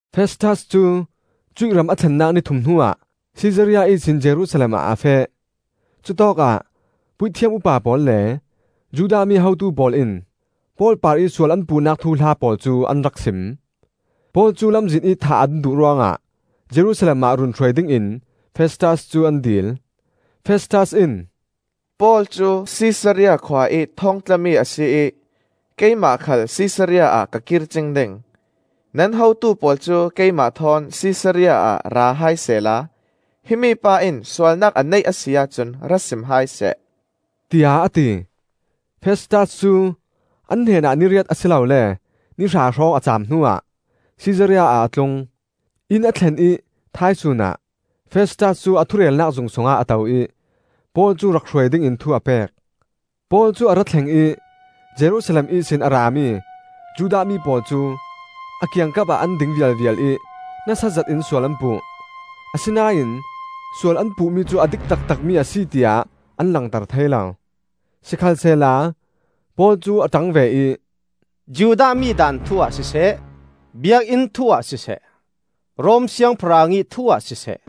Festas cu cuih ram a thlennak ni thum hnuah Sisaria ihsin Jerusalem ah a feh. Cutawkah Puithiam upa pawl le Judah mi hotu pawl in Paul parih sual an puhnak thuhla pawl cu an rak sim. Paul cu lamzin ih thah an duh ruangah Jerusalem ah run hruai dingin Festas cu an dil. Festas in, “Paul cu Sisaria khua ih thawngtlami a si ih keimah khal Sisaria ah ka kir cing ding. Nan hotu pawl cu keimah thawn Sisaria ah ra hai sehla himi pa in sualnak a neih a si ahcun ra sim hai seh,” tiah a ti. Festas cu an hnenah ni riat a si lole ni hra hrawng a caam hnuah Sisaria ah a tlung. Inn a thlen ih thaisun ah Festas cu a thurelnak zung sungah a to ih Paul cu rak hruai dingin thu a pek. Paul cu a ra thleng ih Jerusalem ihsin a rami Judah mi pawl cu a kiangkap ah an ding vialvial ih nasa zetin sual an puh; asinain sual an puhmi cu a dik taktakmi a si tiah an langter thei lo. Sikhalsehla Paul cu a ṭang ve ih, “Judah mi daan thu-ah siseh, Biakinn thu-ah siseh, Rom siangpahrang ih thu-ah siseh,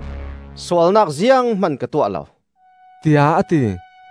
sualnak zianghman ka tuah lo,” tiah a ti.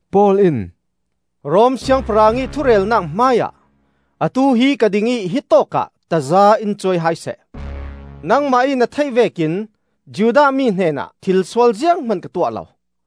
Paul in, “Rom Siangpahrang ih thurelnak hmaiah atu hi ka ding ih hitawk ah taza in cuai hai seh. Nangmah ih na theih vekin Judah mi hnenah thilsual zianghman ka tuah lo.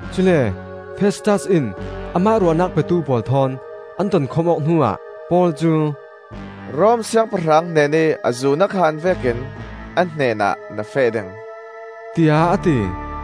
Cule Festas in amah ruahnak petu pawl thawn an tonkhawm awk hnuah Paul cu, “Rom siangpahrang hnenih azu na khan vekin a hnenah na feh ding,” tiah a ti.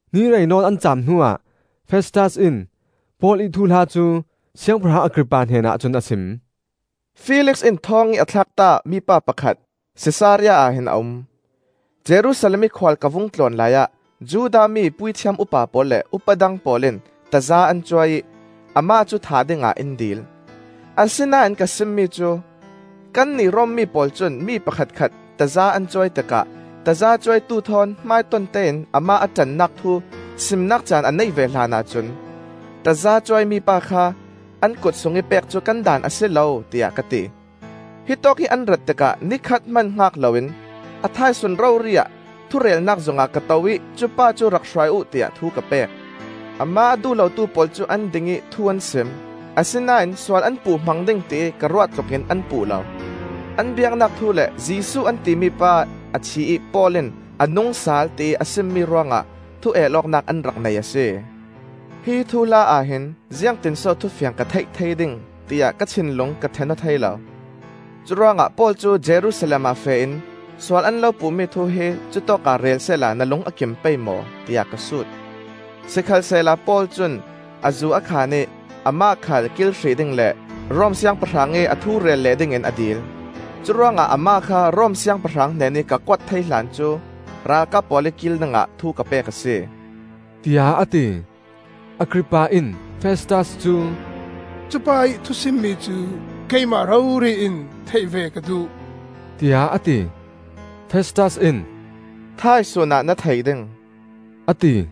Ni rei nawn an caam hnuah Festas in Paul ih thuhla cu siangpahrang Agrippa hnenah cun a sim. “Felix in thawngih a thlakta mipa pakhat Sisaria ah hin a um. Jerusalem ih khual ka vung tlawn laiah Judah mi puithiam upa pawl le upa dang pawl in taza an cuai ih amah cu thah dingah in dil. Asinain ka sim mi cu: Kannih Rom mi pawl cun mi pakhatkhat taza an cuai tikah tazacuaitu thawn hmaiton tein amah a ṭannak thu simnak caan a neih ve hlanah cun tazacuai mipa kha an kut sungih pek cu kan daan a si lo, tiah ka ti. Hitawkih an rat tikah ni khat hman hngak loin a thaisun rori-ah thurelnak zungah ka to ih cupa cu rak hruai uh tiah thu ka pek. Amah a duh lotu pawl cu an ding ih thu an sim, asinain sual an puh hmang ding tiih ka ruah tlukin an puh lo. An biaknak thu le Jesuh an timi pa a thi ih Paul in, ‘A nungsal,’ tiih a simmi ruangah thu el awknak an rak nei a si. Hi thuhla-ah hin ziangtinso thufiang ka theih thei ding, tiah ka thinlung ka ṭhen aw thei lo; curuangah Paul cu Jerusalem ah feh in sual an lo puhmi thu hi cutawkah rel sehla na lung a kim pei maw?” tiah ka sut. Sikhalsehla Paul cun azu a khan ih amah khal kil hrih ding le Rom Siangpahrang ih a thu rel leh ding in a dil. Curuangah amah kha Rom siangpahrang hnenih ka kuat thei hlan cu ralkap pawl ih kil dingah thu ka pek a si,” tiah a ti. Agrippa in Festas cu, “Cupa ih thusimmi cu keimah rori in theih ve ka duh,” tiah a ti. Festas in, “Thaisun ah na thei ding,” a ti.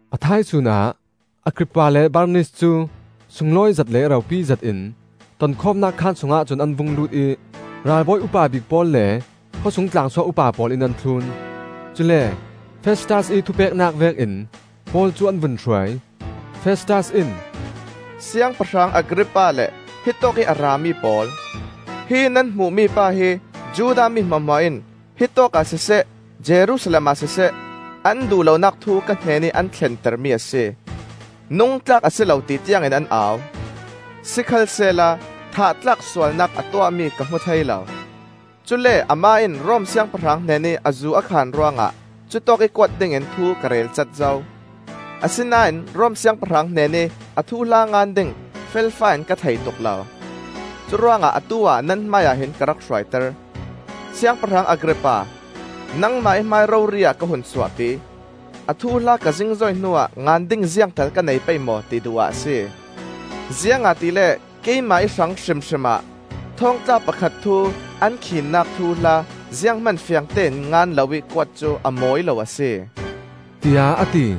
A thaisun ah Agrippa le Bernis cu sunglawi zet le ropi zetin, tonkhawmnak khaan sungah cun an vung lut ih ralbawi upa bik pawl le khawsung tlangsuak upa pawl in an thlun. Cule Festas ih thupeknak vekin Paul cu an vun hruai. Festas in, “Siangpahrang Agrippa le hitawk ih a rami pawl: Hi nan hmuh mipa hi Judah mi hmuahhmuah in, hitawk ah siseh Jerusalem ah siseh, an duh lonak thu ka hnenih an thlentermi a si. Nung tlak a si lo ti tiangin an au. Sikhalsehla thah tlak sualnak a tuahmi ka hmu thei lo. Cule amah in Rom siangpahrang hnenih azu a khan ruangah cutawkih kuat dingin thu ka relcat zo. Asinain Rom siangpahrang hnenih a thuhla ngan ding felfai-in ka thei tuk lo. Curuangah atu-ah nan hmaiah hin ka rak hruaiter. Siangpahrang Agrippa, nangmah ih hmai rori-ah ka hun suahpi. A thuhla ka zingzoi hnuah ngan ding ziangtal ka nei pei maw, ti duh ah a si. Ziangahtile keimah ih hrang hrimhrim ah thawngtla pakhat thu an khiinnak thuhla zianghman fiangtein ngan loih kuat cu a mawi lo a si,” tiah a ti.